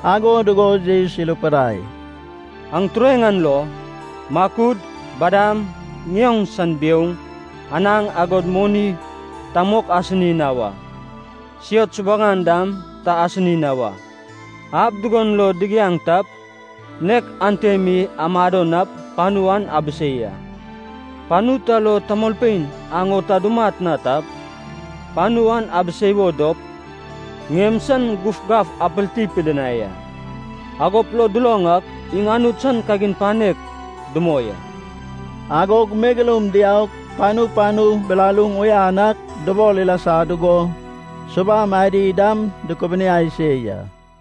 Ago dugo Jesus irupidai, “Aŋ tureŋ an lo, makud, badam, ŋioŋ san biouŋ, anaŋ, agod moni ta mok asini na wa. Siot subuŋan dam ta asini na wa. Ab dugon lo digiaŋ tap, nek ante mi amado nap panu an abisei a. Panu ta lo tamolpein aŋ o ta dumat na tap, panu an abisei wo dop, ŋiem san gufgaf apilti pidinai a. Agop lo duloŋ ak, iŋ Anut san kagin panek dumoi a.” Agog megeloum diaug, panu panu bilaluŋ uyan ak dubol ilasa dugo, subam adi dam dukubiniai se ya.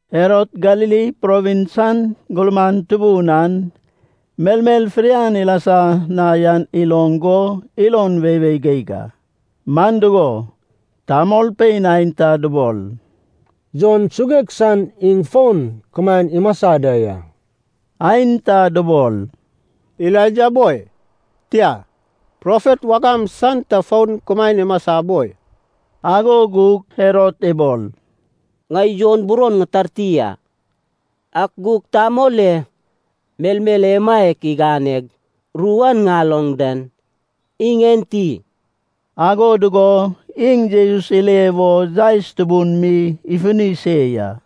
Herod Galili provins san gurman tubun an melmel fidian ilasa na yan iloŋ go ilon weiwei geig a. Man dugo, tamolpein aenta dubol, “Jon suguek san iŋ fon kumaen imasa da ya.” Aenta dubol, “Elaija boi, tia, profet wagam san ta fon kumaen imasa boi.” Ago gug Herod ibol, “Ŋai Jon buron ŋitarti a. Ak gug tamol e melmel emaiak iganeg ru an ŋaloŋ den, iŋ enti?” Ago dugo iŋ Jesus ile wo yaes tubun mi ifuni se ya.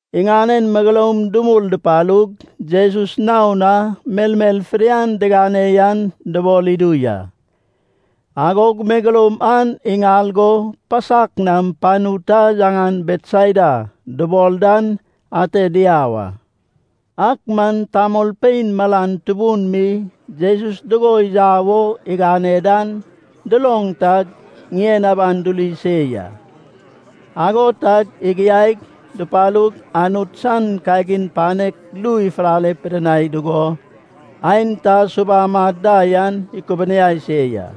Iŋanen megeloum dumul dupalug Jesus naon na melmel fidian digane yan dubol idu ya. Agog megeloum an iŋal go pasak nam panu ta yaŋan Betsaida dubol dan ate diau a. Ak man tamolpein malan tubun mi Jesus dugo yau wo igane dan duloŋ tag, ŋien aban duri se ya. Ago tag igiaig dupalug, Anut san kagin panek ru ifulale pidinai dugo, aenta subam ad da yan ikubuniai se ya.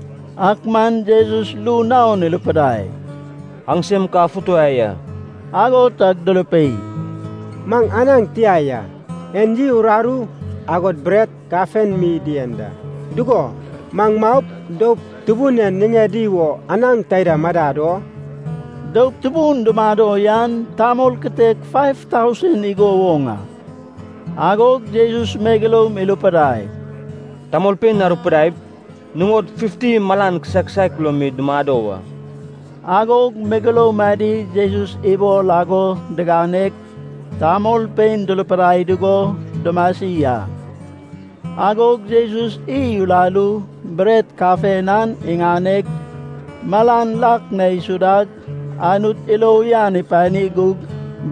Ak man Jesus ru naon irupidai, “Aŋsem ka afutuwai a.” Ago tag durupei, “Maŋ anaŋ tia ya. En iy uraru, agod bret kafen mi dien da. Dugo, maŋ maup, doup tubun en niŋedi wo anaŋ taida madad o?” (Doup tubun dumado yan tamol kitek faiv tausen igo woŋ a.) Agog Jesus megeloum irupidai, “Tamolpein arupidaip, nuŋod fifti malan kisaek kisaek lo mi dumado wa.” Agog megeloum adi Jesus ibol ago diganeg, tamolpein durupidai dugo dumasi a. Agog Jesus iy uraru, bret kafen an iŋaneg, malan lak na isudag, Anut ilo uyan ipani gug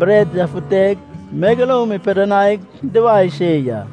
bret yafuteg, megeloum ipidinaig duwae se ya.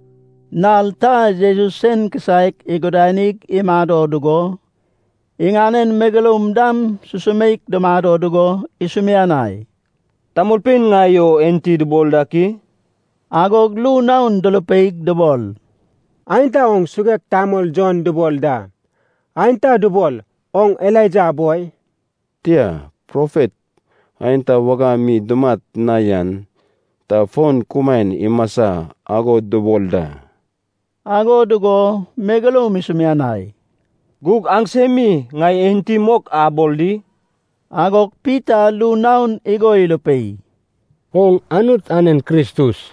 Nal ta Jesus sen kisaek igudanig imado dugo, iŋanen megeloum dam susumeik dumado dugo isumianai, “Tamolpein ŋai o enti dubol dak i?” Agog ru naon durupeig dubol, “Aenta oŋ suguek tamol Jon dubol da. Aenta dubol, oŋ Elaija boi, tia, profet aenta wagam mi dumat na yan ta fon kumaen imasa ago dubol da.” Ago dugo megeloum isumianai, “Gug aŋsem mi ŋai enti mok abol di?” Agog Pita ru naon igo irupei, “Oŋ Anut anen Kristus.”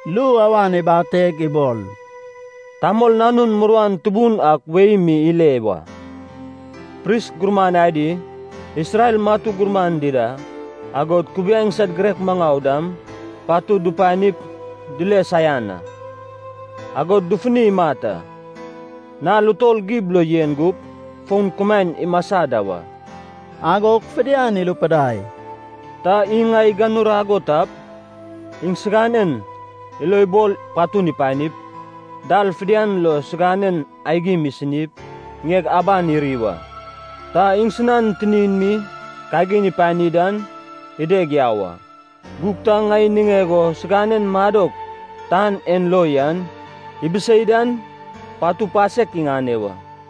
Ru awan ibateg ibol, “Tamol Nanun muruan tubun ak wei mi ile wa. Pris gurman adi, Isrel matu gurman dida, agod kubiaeŋ san girek maŋau dam patud dupanip dile saian a. Agop dufuni imat a. Nal utol gib lo yen gup, fon kumaen imasa da wa.” Agog fidian irupidai, “Ta iŋ ŋai iganurag o tap, iŋsiganen ilo ibol patun ipanip, dal fidian lo siganen aigim isinip, ŋieg aban iri wa. Ta iŋsinan tinin mi kagin ipani dan, ideg yau a. Gug ta ŋai niŋeg o siganen madok tan en lo yan ibisei dan, patu pasek iŋane wa.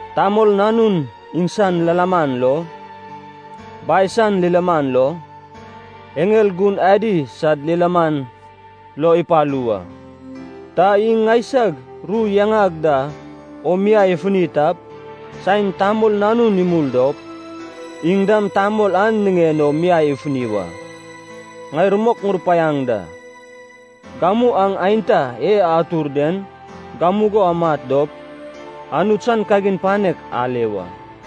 Tamol Nanun iŋsan lilaman lo, Bai san lilaman lo, eŋel gun adi sad lilaman lo ipalu wa. Ta iŋ ŋaisag ru yaŋag da o miai ifuni tap, saen Tamol Nanun imul dop, iŋ dam tamol an niŋen o miai ifuni wa. Ŋai rumok ŋurupaiaŋ da. Gamu aŋ aenta e atur den gamugo amat dop, Anut san kagin panek ale wa.”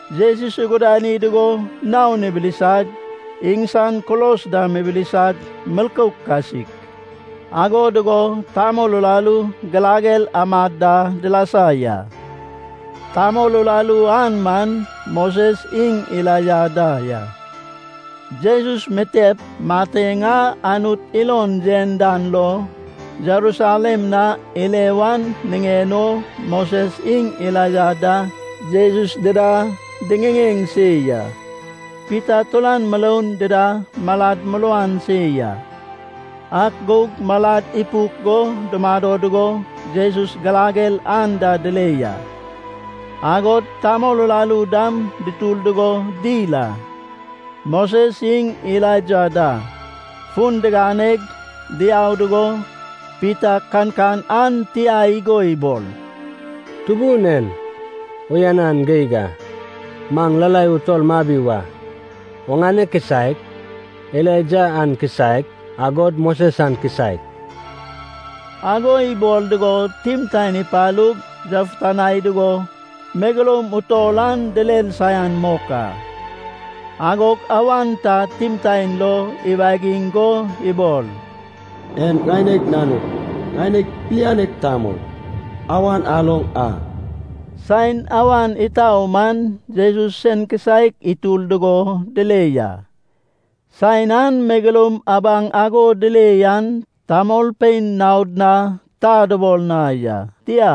Jesus igudani dugo naon ibilisag, iŋsan kulos dam ibilisag milkouk kasik. Ago dugo tamol uraru girager amad da dilasa ya. Tamol uraru an man Moses iŋ Elaija da ya. Jesus mitep mateŋ a Anut ilon yen dan lo Jerusalem na ile wan niŋen o, Moses iŋ Elaija da Jesus dida diŋiŋeŋ se ya. Pita turan muroun dida malad muruan se ya, ak gug malad ipuk go dumado dugo Jesus girager anda dile ya. Agod tamol uraru dam dutur dugo dil a. Moses iŋ Elaija da fun diganeg diau dugo, Pita kankan an tia igo ibol, “Tubun en, uyanan geig a. Maŋ lalai utol mabi wa. Oŋane kisaek. Elaija an kisaek. Agod Moses an kisaek.” Ago ibol dugo timtaen ipalug, yafutanai dugo megeloum utol an direr saian mok a. Agog awan ta timtaen lo iwagiŋ go ibol, “En ŋaineg nanug, ŋaineg Pilianek Tamol. Awan aloŋ a.” Saen awan itau man Jesus sen kisaek itur dugo dile ya. Saen an megeloum abaŋ ago dile yan tamolpein naod na ta dubol na ya. Tia,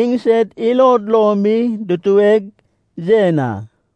iŋsed ilod lo mi dutueg yen a.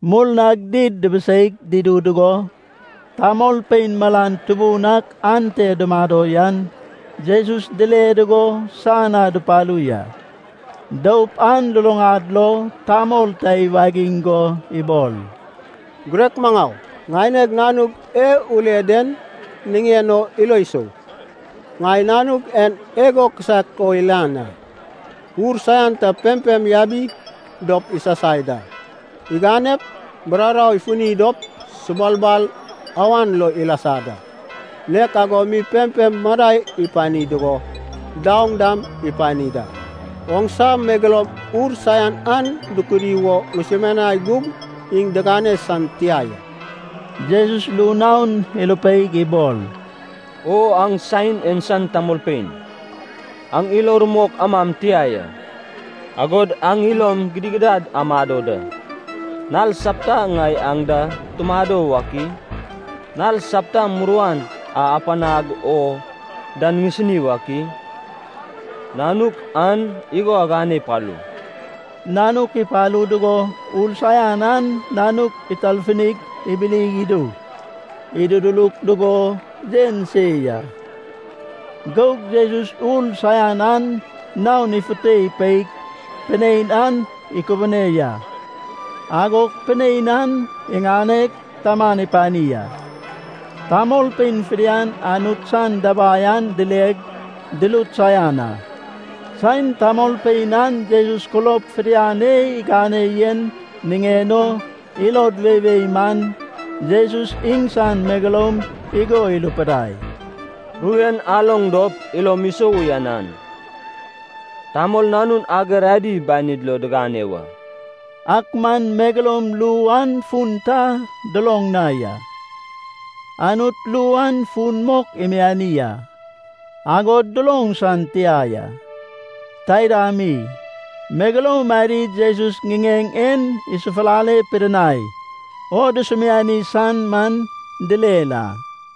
Murnag did dibiseig dudu dugo, tamolpein malan tubun ak ante dumado yan Jesus dile dugo san na dupalu ya. Doup an luluŋad lo tamol ta iwagiŋ go ibol, “Girek maŋau, ŋaineg nanug e ule den niŋen o ilo isou. Ŋai nanug en igo kisaek o lian a. Ur saian ta pempem yabi dop isasai da. Iganep bururau ifuni dop subulbal awan lo ilasa da. Nek ago mi pempem madai ipani dugo, daoŋ dam ipani da. Oŋsa megeloum ur saian an dukudi wo ŋusumianai gug iŋ digane san tia ya.” Jesus ru naon irupeig ibol, “O aŋ saen en san tamolpein, aŋ ilo rumok amam tia ya, agod aŋ ilom gidigidad amado da. Nal sapta ŋai aŋ da tumado wak i? Nal sapta muruan a apanag oŋ dan ŋisini wak i? Nanuk an igo aŋane apalu.” Nanuk ipalu dugo ur saian an nanuk itarfuni ibili idug, idududuruk dugo yen se ya. Gug Jesus ur saian an naon ifute ipeig pinein an ikubune ya. Agog pinein an iŋaneg taman ipani a. Tamolpein fidian Anut san dabai an dileg, durut saian a. Saen tamolpein an Jesus kulob fidian e igane yen niŋen o ilod weiwei man, Jesus iŋsan megeloum igo irupidai, “Ru en aloŋ dop ilom isou uyanan. Tamol Nanun ager adi banid lo digane wa.” Ak man megeloum ru an fun ta duloŋ na ya. Anut ru an fun mok imiani a, agod duloŋ san tia ya. Taida mi, megeloum adi Jesus ŋiŋeŋ en isafulale pidinai o dusumiani san man direr a.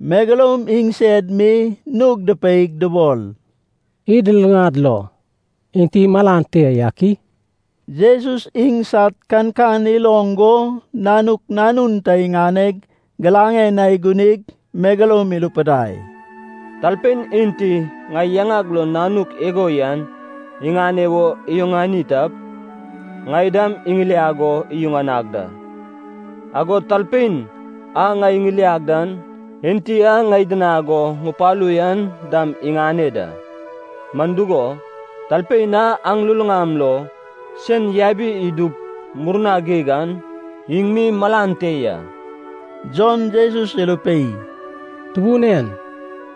Megeloum iŋsed mi nug dupeig dubol, “Id luluŋad lo enti malan te yak i?” Jesus iŋsad kankan iloŋ go nanuk nanun ta iŋaneg giraŋen na igunig megeloum irupidai, “Talpein enti ŋai yaŋag lo nanuk igo yan iŋane wo iyuŋani tap, ŋai dam iŋiliag o iyuŋanag da. Agod talpein a ŋai iŋiliag dan, Enti a ŋai idinag go ŋupalu yan dam iŋane da. Man dugo, talpein a aŋ luluŋam lo sen yabi idup murna geig an, iŋ mi malan te ya.” Jon Jesus irupei, “Tubun en,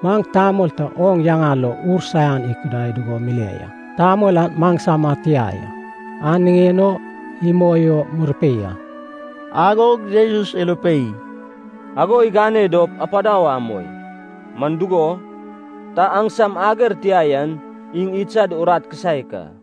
maŋ tamol ta oŋ yaŋa lo ur saian ikudai dugo mile ya. Tamol an maŋsama tia ya, an niŋen o imoi o murupei a.” Agog Jesus irupei, “Ago igane dop apadau amoi. Man dugo, ta aŋsam ager tia yan iŋ idsad urat kisaek a.”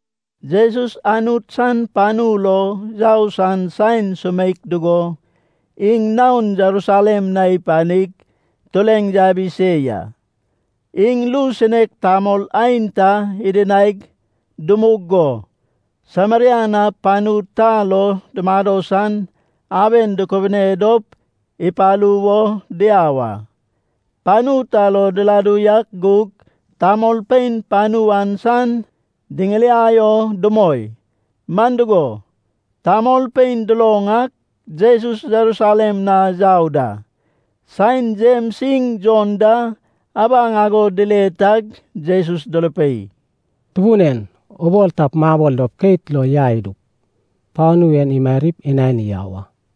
Jesus Anut san panu lo yau san saen sumeik dugo, iŋ naon Jerusalem na ipanig tureŋ yabi se ya. Iŋ ru sinek tamol aenta idinaig dumug go Sameria na panu ta lo dumado san aben dukubune dop ipalu wo diau a. Panu ta lo diladu yak gug, tamolpein panu an san diŋiliai o dumoi. Man dugo, tamolpein duloŋ ak, Jesus Jerusalem na yau da. Saen Jems iŋ Jon da abaŋ ago dile tag Jesus durupei, “Tubun en, ubol tap, mabol dop keit lo yai idup, panu en imarip inani yau a.”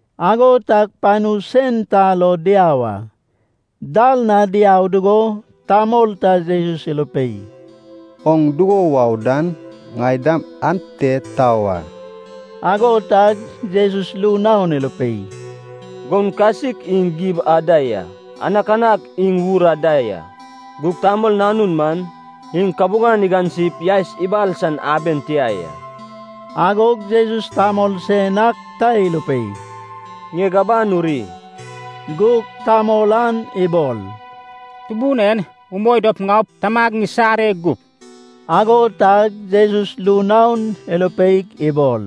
Ago tag panu sen ta lo diau a. Dal na diau dugo, tamol ta Jesus irupei, “Oŋ dugo wau dan ŋai dam ante tau a.” Ago tag Jesus ru naon irupei, “Goun kasik iŋ gib ad da ya. Anakanak iŋ wur ad da ya. Gug Tamol Nanun man, iŋ kabuŋan igansip yaes ibal san aben tia ya.” Agog Jesus tamol sen ak ta irupei, “Ŋieg aban uri.” Gug tamol an ibol, “Tubun en, umoi dop ŋaup, tamag ŋisare gup.” Ago tag Jesus ru naon irupeig ibol,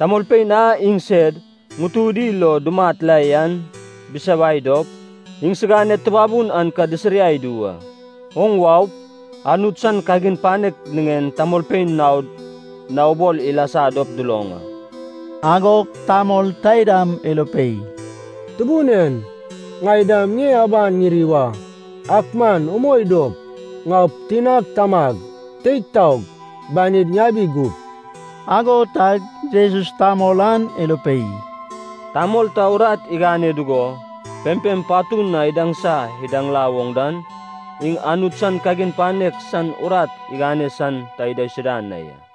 “Tamolpein a iŋsed ŋutudi lo dumat la yan bisawai dop, iŋsiganed tubabun an ka disiriai idu wa. Oŋ waup, Anut san kagin panek niŋen tamolpein naod na ubol ilasa dop duloŋ a.” Agog tamol taidam irupei, “Tubun en, ŋai dam ŋie aban ŋiri wa. Ak man umoi dop, ŋaup, tinag tamag teig taog banid ŋabi gup.” Ago tag Jesus tamol an irupei, “Tamol ta urat igane dugo pempem patun na idaŋsa idaŋla woŋ dan, iŋ Anut san kagin panek san urat igane san ta idaisuda na ya.”